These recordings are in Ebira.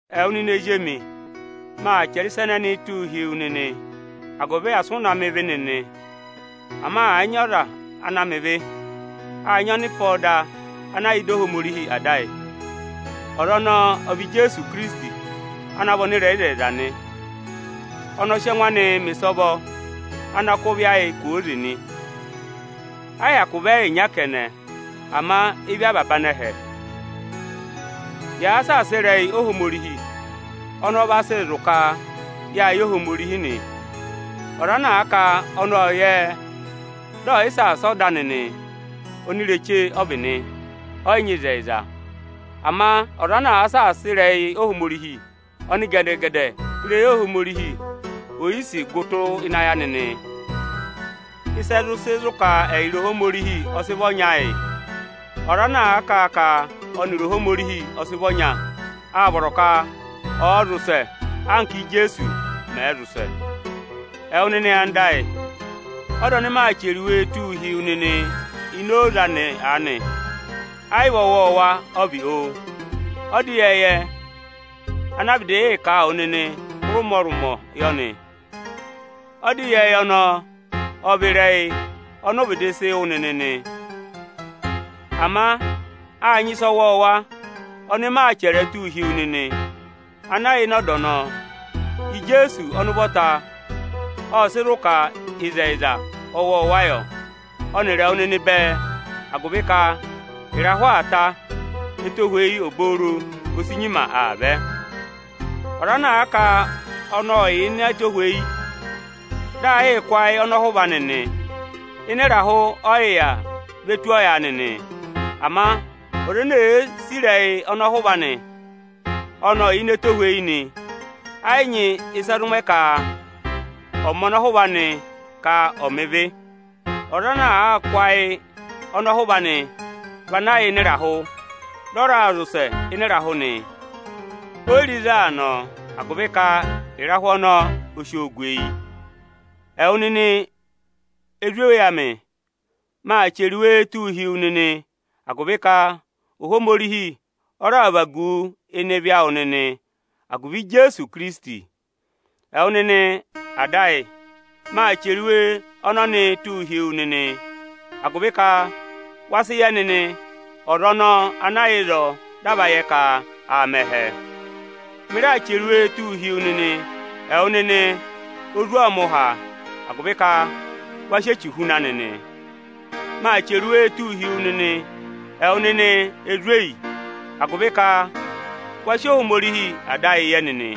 Ẹwụ nịnị ezi emi, maa chẹrẹ ịsa ẹnẹnịị tụ́ụ hi wu nịnị agụvị asị ụ mẹ̀ ịvị nịnị. Ama àa nyị ọza ana mẹ ịvị, áa nyị ọnịpọda ọnya ana yà ịdị Ohomorihi Ada ayị; ọza ọnọọ ọ vị Ijeesu Ikirisiti ana vị ọnịrẹyịzẹyịza nị. Ọnị ọ sị ẹngụ anị mẹ̀ ịsọvọ ana kụ́ ịvị ayị kwooze nị. Ẹ́ yị hyakụ vị ẹ́ẹyịnya kẹnẹ, ama ịvị avaba anẹhẹ. Yàa saasa ịrẹyị Ohomorihi, ọnị ọ vaa sị zụ̀ ka yáa yẹ Ohomorihi nị. Ọza ana áa ka ọnị ọ́ọ yẹ ẹ, dị ẹ̀ yị saasa ọda anị nị, onireche ọ vị nị, ọ́ yị nyị ịzẹyịza. Ama ọza ana àa saasa ịrẹyị Ohomorihi, ọnị gẹdẹ-gẹdẹ ịrẹyị Ohomorihi oyisì gụ tụ́ ịnị ayị anị nị. Ịsị ẹ zụ sị zụ̀ ka ẹyịrị Ohomorihi ọ sị vị ọnya yị: Ọza ana àa ka ọnịrị Ohomorihi ọ sị vị ọnya, áa vọrọ ka ọ̀ọ zị ụsẹ anka Ijeesu mẹ̀ zị ụsẹ. Ẹwụ nịnị anda ayị, ọda ọnị maa chẹrẹ tụ́ụ hi wu nịnị ini oze anị aanị, ẹ́ yị vị ọwọọwa ọ vị. Ọda ịyẹẹyẹ ana a vịdị aa yịị kà a wụ nịnị hụrị ụmọrụmọ yọ nị. Ọda ịyẹẹyẹ ọnọọ ọ vị ịrẹyị ọnị ụ vịdị sị wụ́ nịnị nị. Ama áa nyị ịsa ọwọọwa ọnị maa chẹrẹ ẹ tụ́ụ hi wu nịnị ana yà ịnị ọda ọnọọ. Ijeesu ọnị ụvọta ộ sị zụ ka ịzẹyịza ọwọọwa yọ, ọnịrị ẹwụ nịnị bẹẹ; agụvị ka ịrahụ aa tá, ẹtohweyi obooro o si nyima aa vẹ. Ọza ana àa ka ọnị yà ini ẹtohweyi, dị aa yịị kụ́ ayị ọnọhụva anị nị, ịnị ịrahụ ọ yị yà vi ve tu ọyaanị nị. Ama ọza ene èe sì ịrẹyị ọnọhụva anị, ọnị ọ yà ini ẹtohweyi nị; ẹ́ yị nyị ịsị ẹ zụ mẹ ka ọ̀ mẹ ọnọhụva anị ka ọ̀ mẹ ịvị. Ọza ana àa kụ́ ayị ọnọhụva anị, vị ana yà ịnị ịrahụ, dị ọ raa zị ụsẹ ịnị ịrahụ nị; O yi re ịzị aa nọ agụvị ka ịrahụ ọnọọ o si o gu eyi. Ẹwụ nịnị ezweyi emi, maa chẹrẹ iwe tụ́ụ hi wu nịnị, agụvị ka Ohomorihi ọ raà vagu wu ịnị ịvị awụ nịnị agụvị Ijeesu Ikirisiti. Ẹwụ nịnị Ada, maa chẹrẹ iwe ọnọnịị tụ́ụ hi wu nịnị agụvị ka wa sị yẹ ọza ọnọọ ana yà ịzọọ dị a va yẹ ka aa mẹ ẹhẹ. Mị raa chẹrẹ iwee tụ́ụ hi ẹwụ nịnị ezwọọmụha agụvị ka wa sị echu huna nịnị. Maa chẹrẹ iwee tụ́ụ hi ẹwụ nịnị ezweyi agụvị ka waa yẹ Ohomorihi Ada ayị.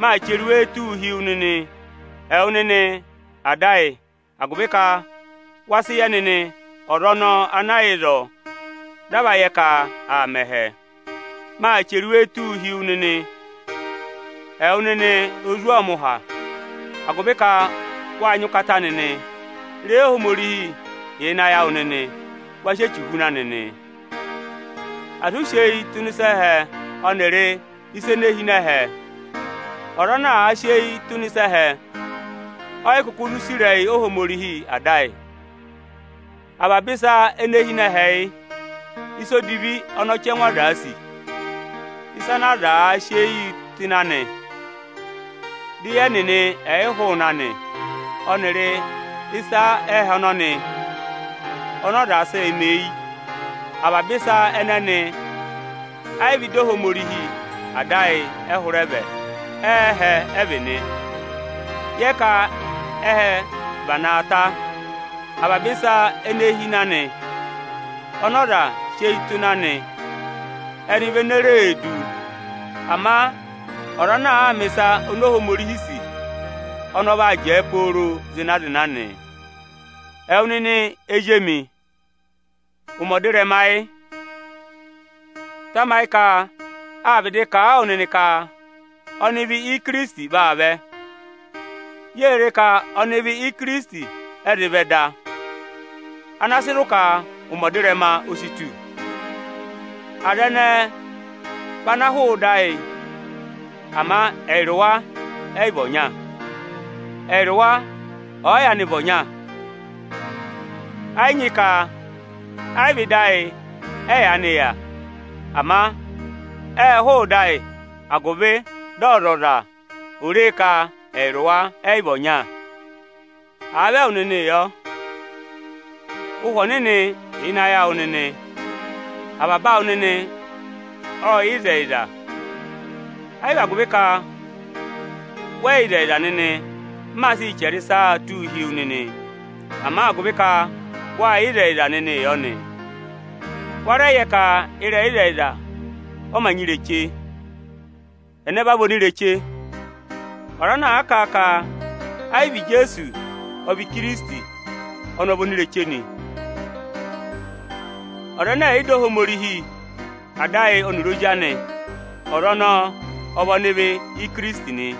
Maa chẹrẹ iwee tụ́ụ hi ẹwụ nịnị ada ayị agụvị ka waa yẹ ọza ana yà ịzọọ dị a va yẹ ka aa mẹ ẹhẹ. Maa chẹrẹ iwee tụ́ụ hi ẹwụ nịnị ezwọọmụha agụvị ka wáa nyị ụkata nịnị; ịrẹyị Ohomorihi yà ịnị ayị awụ nịnị, wa sị Echu huna nịnị. Asị ụ sị eyi tụ́ ịnị ịsa ẹhẹ ọnịrị ịsa ene hi ini ẹhẹ. Ọza ana àa sị eyi tụ́ ịnị ịsa ẹhẹ, o yi kuku zụ sì ịrẹyị Ohomorihi Ada ayị. Avaba ịsa ene hi ịnị ẹhẹ yị: Ịsa edivi ọnị ọchẹngụ azaā sì, ịsa ana azaā sị eyiī tụ́ ịnị anị, dị eyi ẹnịnị ẹ̀ yị hụụnị anị, ọnịrị ịsa ẹhẹ ọnọnị ọnị ọza sịị̄ mẹ eyi. Avaba ịsa ẹnẹnị ẹ́ yị vị ịdị Ohomorihi Ada ayị ẹ hụrẹ vẹ, ẹ́ẹhẹ ẹ vị nị. Yẹ ka ẹhẹ vị ana aa ta; avaba ịsa ene hi ịnị anị ana aza sị eyi tụ́ ịnị anị, ẹnị vị ene ree du. Ama ọza ana àa mẹ̀ ịsa oni Ohomorihi sì, ọnị ọ vaa jẹẹ pooro zịna-zịna nị. Ẹwụ nịnị ezi emi, ụmẹ ọdịrẹma yị. Tamayị ka â vịdị kà a wụ nịnị ka ọnịvị Ikirisiti vaa vẹ. Yée re ka ọnịvị Ikirisiti ẹ zị vẹ da, ana sị zụ̀ ka ụmẹ ọdịrẹma o si tù. Aza ẹnẹẹ vị ana hụụ ịdị ayị agụvị ka ẹyịrị wa ẹ́ yị vị ọnya. Ẹyịrị wa ọ̀ọ yaanị vị ọnya, ẹnịnị vị ana yaanị yà pe yị. Ama ẹ́ẹ hụụ ịdị ayị agụvị dị ọzọza è ree ka ẹyịrị wa ẹ́ yị vị ọnya. Àa vị ẹwụ nịnị yọ, Ụhwẹ Ọnịnị yà ịnị ayị awụ nịnị; avaba awụ nịnị ọ́ọ yẹ ịzẹyịza. Ẹ́ yị vị agụvị ka wẹ yị yẹ ịzẹyịza nịnị m maa sịị chẹrẹ ịsaa tụ́ụ hi wu nịnị, ama agụvị ka waa yẹ ịzẹyịza nịnị yọ nị. Wa rẹ yẹ nịnị ka ịrẹyị ịzẹyịza ọ ma nyị ireche. Ẹnẹ vị onireche? Ọza ana àa kà a ka ẹ́ yị vị Ijeesu ọ vị Ikirisiti, ọnị ọ vị onireche nị. Ọza ẹnẹ ẹ̀ yị dọ Ohomorihi Ada ayị ọnịrị Ozi anị, ọza ọnọọ ọ vị ọnịvị Ikirisiti nị.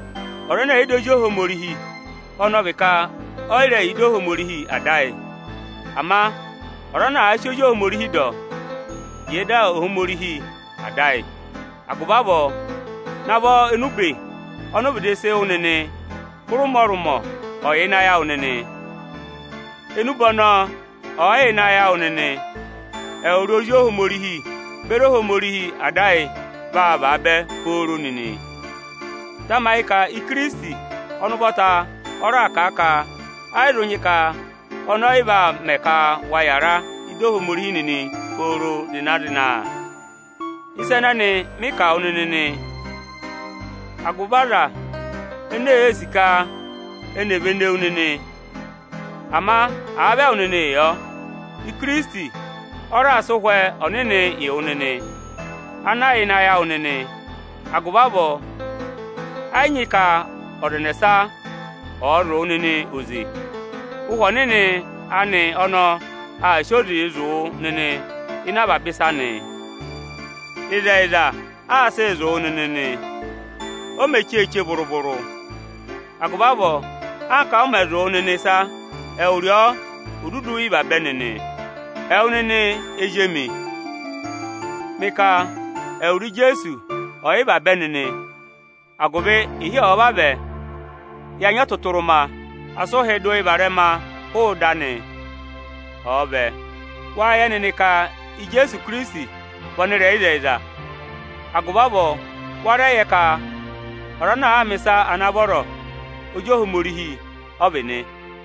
Ọza ẹnẹ ẹ̀ yị dọ Ozi Ohomorihi, vị ẹ̀ yị rẹ dọ Ohomorihi Ada ayị avọọ nị. Ama ọza ana àa sị Ozi Ohomorihi dọ, vị ọ rẹ dọ Ohomorihi Ada ayị avọọ nị. Agụvị avọọ, navọ enube ọnị u vịdị sị wụ nịnị hụrị ụmọrụmọ ọ̀ yà ịnị ayị awụ nịnị. Enube ọnọọ ọ̀ọ yà ịnị ayị awụ nịnị, ẹwụrị Ozi Ohomorihi beri Ohomorihi Ada ayị vaa vaabẹ nịnị pooro. Tamayị ka Ikirisiti ọnị ụvọta ọ raà kà a ka ẹ́ yi zụ nyị ka ọnị ẹ́yị vaa mẹ ka wa yara ịdị Ohomorihi nịnị pooro zịna-zịna. Ịsa ẹnẹnị mị kà wụ nịnị nị agụvị aza ene ee sì ka eni è vene wu nịnị. Ama àa vị ẹwụ nịnị yọ, Ikirisiti ọ raà sị Ụhwẹ Ọnịnị yị wụ ana yà ịnị ayị awụ nịnị. Agụvị avọọ, ẹ́ yị nyị ka ọza ẹnẹsa ọ̀ọ zụ̀ wụ nịnị oze. Ụhwẹ Ọnịnị anị ọnọọ aa sị oze zụ̀ wụ nịnị ịnị avaba ịsa nị. Ịzẹyịza aa sịị zụ̀ wụ nịnị nị, o me cheeche vụrụ-vụrụ. Agụvị avọọ, anka ọ mẹ zụ̀ wụ nịnị ịsa, ẹwụrị ọ ò dudu rị vabẹ nịnị. Ẹwụ nịnị ezi emi, mị ka ẹwụrị Ijeesu ọ̀ rị vabẹ nịnị, agụvị ịhị ọ̀ọ vavẹ, ya nyị ọtụtụrụma, asị ụhị dụ yị varẹma hụụ ịdị anị, ọ̀ọ vẹ. Wáa yẹ nịnị ka Ijeesu Ikirisiti vị ọnịrẹyịzẹyịza; agụvị avọọ wa rẹ yẹ ka ọza ana àa mẹ̀ ịsa ana vọrọ, ozi Ohomorihi ọ vị nị.